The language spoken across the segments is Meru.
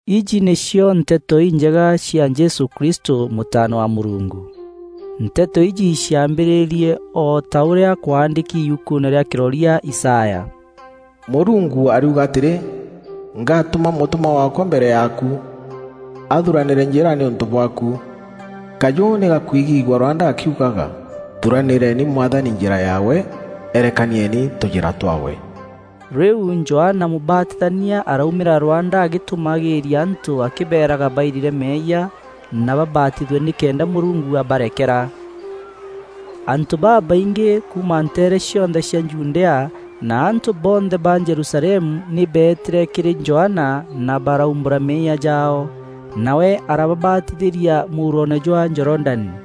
Iji nîcio Nteto Injega cia Jesû Kristû, Mûtaana wa Mûrungu. Nteto iji ciambîrîrie o ta ûrîa kwaandîki yukuune rîa Kîroria Isaya: “Mûrungu ariuga atîrî, ‘Ngaatûma mûtûmwa waakwa mbere yaaku; athuranîre njîra nîûntû bwaaku.’ Kajû nî gakwigîîgua rwanda gakiugaga: ‘Thuranîreni Mwathani njîra yaawe, erekanieni tûjîra twaawe.’” Rîu Johana Mûbatithania araumîra rwanda agîtûmagîîria antû akîbeeraga bairire meeyia na babatithue nîkenda Mûrungu abarekera. Antû babaingî kuuma nteere cionthe cia Judea na antû bonthe ba Jerusalemu nî beetîre kîrî Johana na baraumbûra meeyia jaao, nawe arababatithîria mûuroone jwa Jorodani.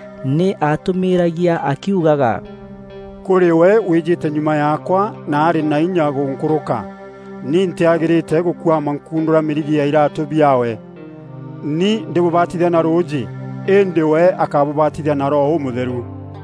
Nî aatûmîragia akiugaga, “Kûrî we wîjîte nyuma yaakwa na arî na inya gûnkûrûka. Ni ntîagîrîte gûkuama nkundûra mîrigi ya iraatû biaawe. Ni ndîbûbatithia na rûûjî, îndî we akabûbatithia na Roho Ûmûtheru.”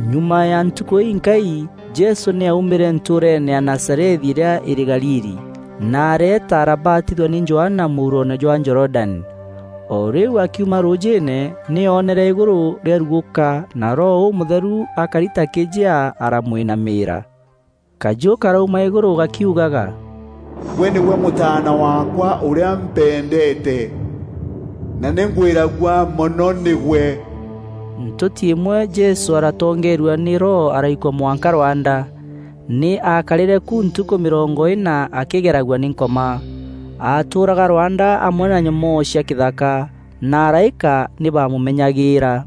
Nyuma ya ntukû inkai, Jesû nî aumîre ntûûreene ya Nazarethi îrîa îrî Galili, na areeta arabatithua nî Johana mûuroone jwa Jorodani. O rîu akiuma rûûjîîne, nî oonere îgûrû riarugûka na Roho Ûmûtheru akari ta kîjea aramwînamîîra. Kajû karauma îgûrû gakiugaga, “Gwe nîgwe Mûtaana waakwa ûrîa mpendeete, na nî ngwîragua mono nîgwe.” Ntûti îmwe Jesû aratongeerua nî Roho araikua mwanka rwanda. Nî aakarîre ku ntukû mîrongo îna akîgeragua nî Nkoma. Aatûûraga rwanda amwe na nyomoo cia kîthaka, na araîka nî baamûmenyagîîra.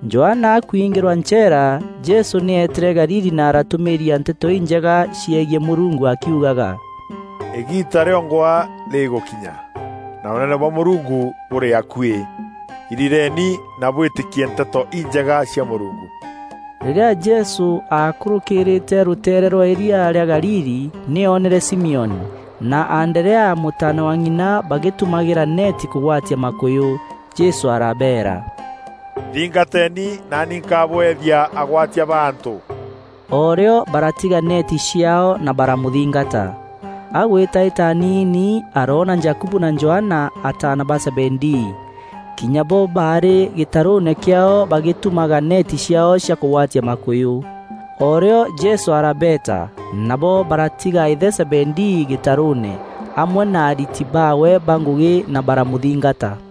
Johana akwiingîrwa ncheera, Jesû nî eetîre Galili na aratûmîîria Nteto Injega ciegiî Mûrungu akiugaga, “Îgiita rîongwa rîgûkinya, na Ûnene bwa Mûrungu bûrî akuî. Irireeni na bwîtîkie Nteto Injega cia Mûrungu.” Rîrîa Jesû aakûrûkîrîîte rûteere rwa îria rîa Galili, nî oonere Simioni, na Anderea mûtaana wa ng'ina bagîtumagîra neeti kûgwatia makûyû. Jesû arabeera, “Nthingateni naani nkabweethia agwatia ba antû.” O rîo baaratiga neeti ciaao na baramûthingata. Agûîtaîta aniini, aroona Jakubu na Johana, ataana ba Zebedii. Kinya bo baarî gîtarûûne kîaao bagîtumaga neeti ciaao cia kûgwatia makûyû. O rîo Jesû arabeeta, nabo baratiga îthe Zebedii gîtarûûne, amwe na ariti baawe ba ngûgî na baramûthingata.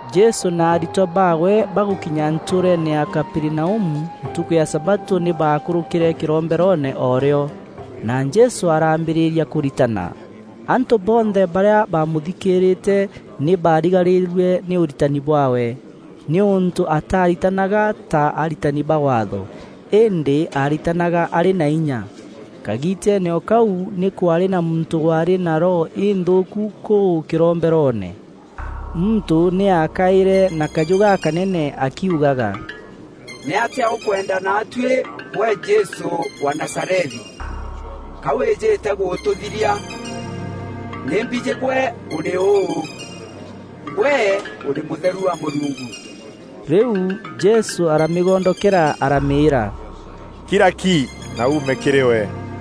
Jesû na aritwa baawe bagûkinya ntûûreene ya Kaperinaumu ntukû ya sabatû nî baakûrûkîre kîromberoone o rîo, na Jesû araambîrîria kûritana. Antû bonthe barîa baamûthikîîrîte nî baarigarîrue nî ûritani bwaawe, nîûntû ataaritanaga ta aritani ba Waatho, îndî aaritanaga arî na inya. Kagiiteene o kau nî kwaarî na muntû waarî na roho înthûûku kûu kîromberoone. Muntû nî aakaîre na kajû gakanene akiugaga, “Nîatîa ûkwenda naatuî, gwe Jesû wa Nazarethi? Ka wîjîte gûtûthiria? Nî mbijî gwe ûrî ûû, gwe ûrî Mûtheru wa Mûrungu.” Rîu Jesû aramîgondokera aramîîra, “Kira ki, na uume kîrî we!”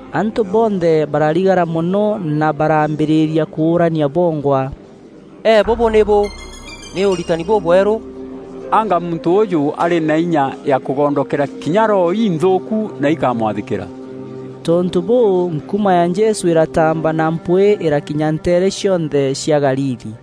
Antû bonthe bararigara mono na baraambîrîria kûûrania bongwa: “E bûbû nî bû? Nî ûritani bûbweru? Anga muntû ûûjû arî na inya ya kûgondokera kinya roho inthûûku, na ikamwathîkîra!” Tontû bûû, nkuma ya Jesû îrataamba na mpwîî îrakinya nteere cionthe cia Galili.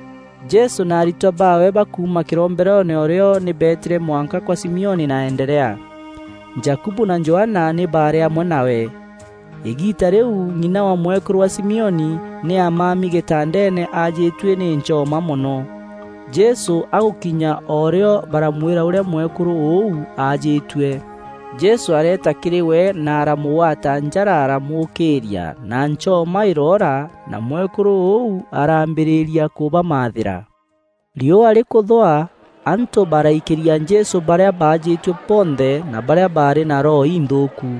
Jesû na aritwa baawe bakuuma kîromberoone o rîo nî beetîre mwanka kwa Simioni na Anderea. Jakubu na Johana nî baarî amwe nawe. Îgiita rîu, ng'ina wa mwekûrû wa Simioni, nî aamami gîtandeene aajîtue nî nchoma mono. Jesû agûkinya o rîo baramwîra ûrîa mwekûrû ûu aajîtue. Jesû areeta kîrî we na aramûgwata njara aramûûkîîria na nchoma îroora na mwekûrû ûu araambîrîria kûbamathîra. Riûa rîkûthûa, antû baraikîria Jesû barîa baajîtue bonthe na barîa baarî na roho inthûûku.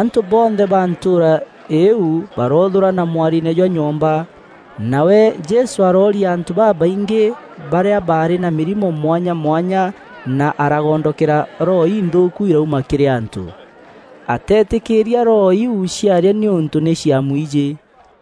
Antû bonthe ba ntûûra îîu baroothûrana mwariine jwa nyomba. Nawe Jesû arooria antû babaingî barîa baarî na mîrimo mwanya mwanya na aragondokera roho inthûûku irauma kîrî antû. Atetîkîîria roho iu ciaria nîûntû nî ciamwijî.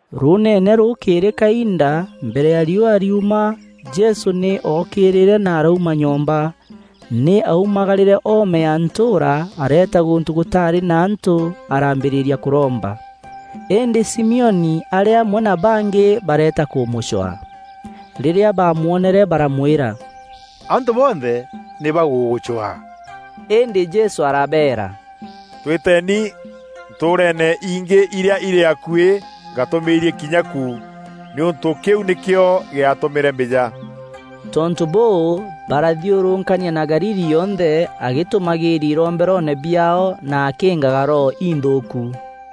Rûûneene rûkîîrî kainda mbere ya riûa rîuma, Jesû nî ookîîrîre na arauma nyomba. Nî aumagarîre oome ya ntûûra areeta gûntû gûtaarî na antû araambîrîria kûromba. Îndî Simioni arî amwe na bangî bareeta kûmûcwaa. Rîrîa baamwonere baramwîra, “Antû bonthe nî bagûgûcwaa.” Îndî Jesû arabeera, “Twîteni ntûûreene ingî irîa irî akuî ngatûmîîrie kinya ku, nîûntû kîu nîkîo gîatûmîre mbîja.” Tontû bûû, barathiûrûkania na Galili yonthe agîtûmagîîria iromberoone biaao na akîîngaga roho inthûûku.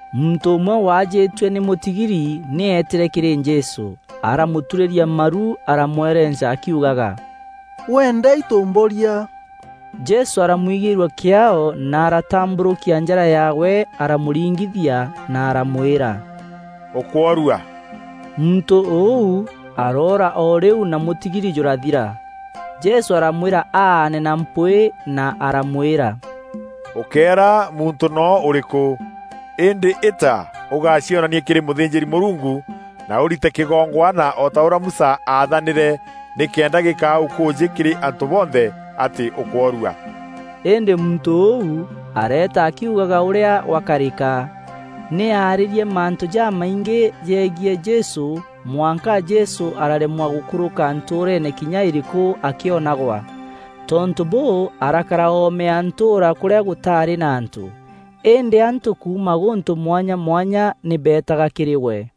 Muntû ûmwe waajîtue nî mûtigiri nî eetîre kîrî Jesû aramûturîria maru aramwerenca akiugaga, “Weenda itû mboria.” Jesû aramwigîîrua kîaao na aratambûrûkia njara yaawe aramûringithia na aramwîra, “Ûkûorua.” Muntû ûu aroora o rîu na mûtigiri jûrathira. Jesû aramwîra aane na mpwîî na aramwîra, “Ûkéera muntû noo ûrîkû. Îndî îta ûgacionanie kîrî mûthînjîri-Mûrungu na ûrite kîgongwana o ta ûrîa Musa aathanîre nîkenda gîkaa ûkûûjî kîrî antû bonthe atî ûkworua.” Îndî muntû ûu areeta akiugaga ûrîa gwakarîka. Nî aarîrie mantû jamaingî jegiî Jesû mwanka Jesû araremwa gûkûrûka ntûûreene kinya îrîkû akîonagwa. Tontû bûû arakara oome ya ntûûra kûrîa gûtaarî na antû. Îndî antû kuuma gûntû mwanya mwanya nî beetaga kîrî we.